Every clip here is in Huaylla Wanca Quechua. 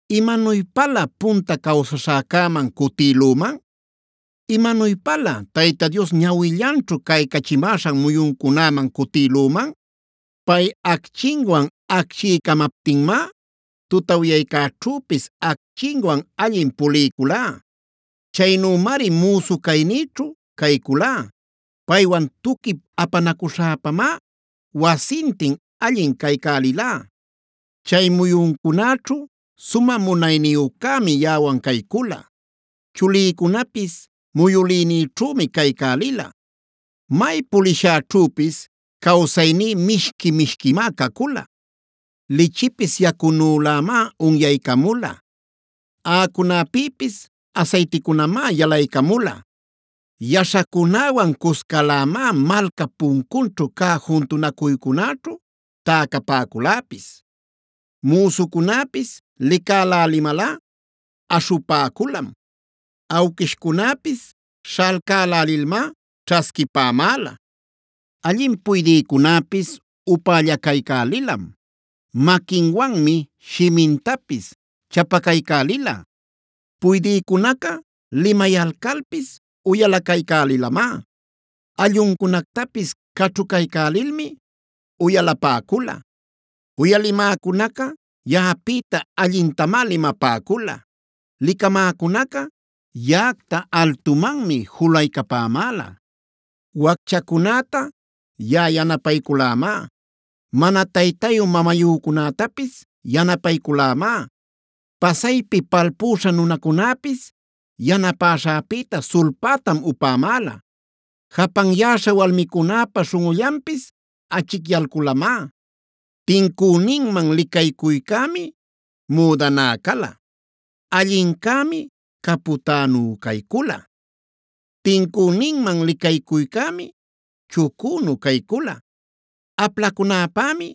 “¿Imanuypalä punta cawsaśhäcäman cutïlüman? ¿Imanuypalä Tayta Dios ñawillanćhu caycachimäśhan muyuncunäman cutïlüman? Pay acchinwan acchiycamaptinmá, tutawyaycäćhüpis acchinwan allin puliyculá. Chaynümari müsu caynïćhu cayculá. Paywan tuquip apanacuśhäpamá wasintin allin caycälilá. Chay muyuncunäćhu Sumä Munayniyücämi yaꞌawan caycula; chulïcunapis muyülïnïćhümi caycälila. May pulishäćhüpis cawsayní mishqui-mishquimá cacula. Lichipis yacunülämá unyaycamula; aꞌacunapïpis asayticunamá yalaycamula. “Yaśhacunäwan cuscalämá, malcap puncunćhu cä juntunacuycunäćhu täcapäculäpis. Müsucunäpis licälälimalꞌa aśhupäculam. Awquishcunäpis śhalcalcälilmá ćhasquipämäla. Allin puydïcunäpis upällacaycälilam; maquinwanmi shimintapis chapacaycälila. Puydïcunaca limayalcalpis uyalacaycälilamá; alluncunactapis caćhucaycälilmi uyalapäcula. “Uyalimäcunaca yaꞌapïta allintamá limapäcula; licamäcunaca yaꞌacta altumanmi julaycapämäla. Wacchacunäta yaꞌa yanapayculämá; mana taytayu-mamayücunätapis yanapayculämá. Pasaypi palpüśha nunacunäpis yanapäśhäpïta sulpätam upämäla; japanyäśha walmicunäpa śhunꞌullanpis achicyalculamá. Tincüninman licaycuycämi müdaná cala; allincämi capütänu caycula, tincüninman licaycuycämi chucünu caycula. Aplacunäpämi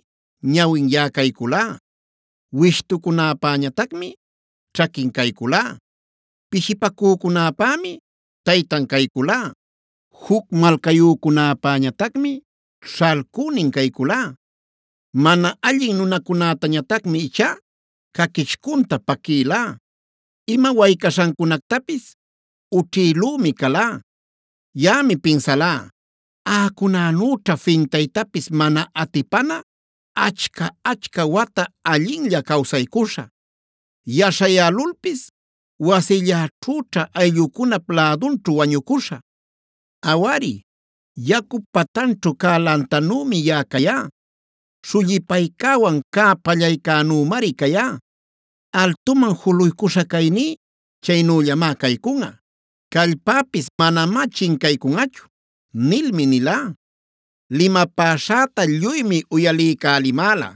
ñawin yaꞌa cayculá; wishtucunäpäñatacmi ćhaquin cayculá. Pishipacücunäpämi taytan cayculá; juc malcayücunäpäñatacmi śhalcünin cayculá. Mana allin nunacunätañatacmi ichá caquichcunta paquïlá; ima waycaśhancunactapis ućhïlümi calá. “Yaꞌami pinsalá: ‘Aꞌucunänüćha fintaytapis mana atipana, achca-achca wata allinlla cawsaycuśhä; yaśhayälulpis wasilläćhüćha ayllücunap lädunćhu wañucuśhä. Awari, yacup patanćhu cä lantanümi yaꞌa cayá;a śhullipaycäwan cä pallaycänümari cayá. Altuman juluycuśha cayní chaynüllamá caycunꞌa; callpäpis manamá chincaycunꞌachu’ nilmi nilá. “Limapäśhäta lluymi uyaliycälimäla;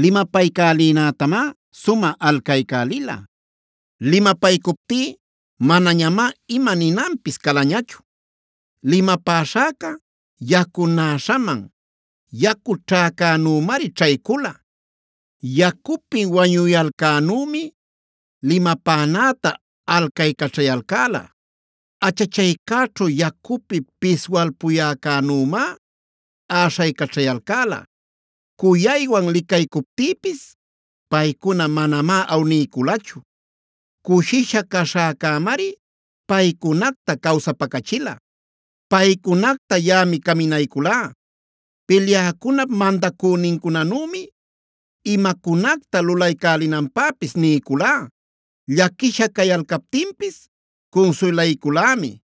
limapaycälinätamá sumä alcaycälila. Limapaycuptí manañamá ima ninanpis calañachu; limapäśhäca yacunäśhaman yacu ćhäcänümari ćhaycula. Yacupi wañuyalcänümi limapänäta alcaycaćhayalcäla; achachaycäćhu yacupi piswalpuyäcänümá äśhaycaćhayalcäla. Cuyaywan licaycuptïpis paycuna manamá awniyculachu; cushisha caśhäcämari paycunacta cawsapacachila. Paycunacta yaꞌami caminayculá. Pilyäcunap mandacünincunanümi imacunacta lulaycälinanpäpis niyculá, llaquisha cayalcaptinpis cunsuylayculämi.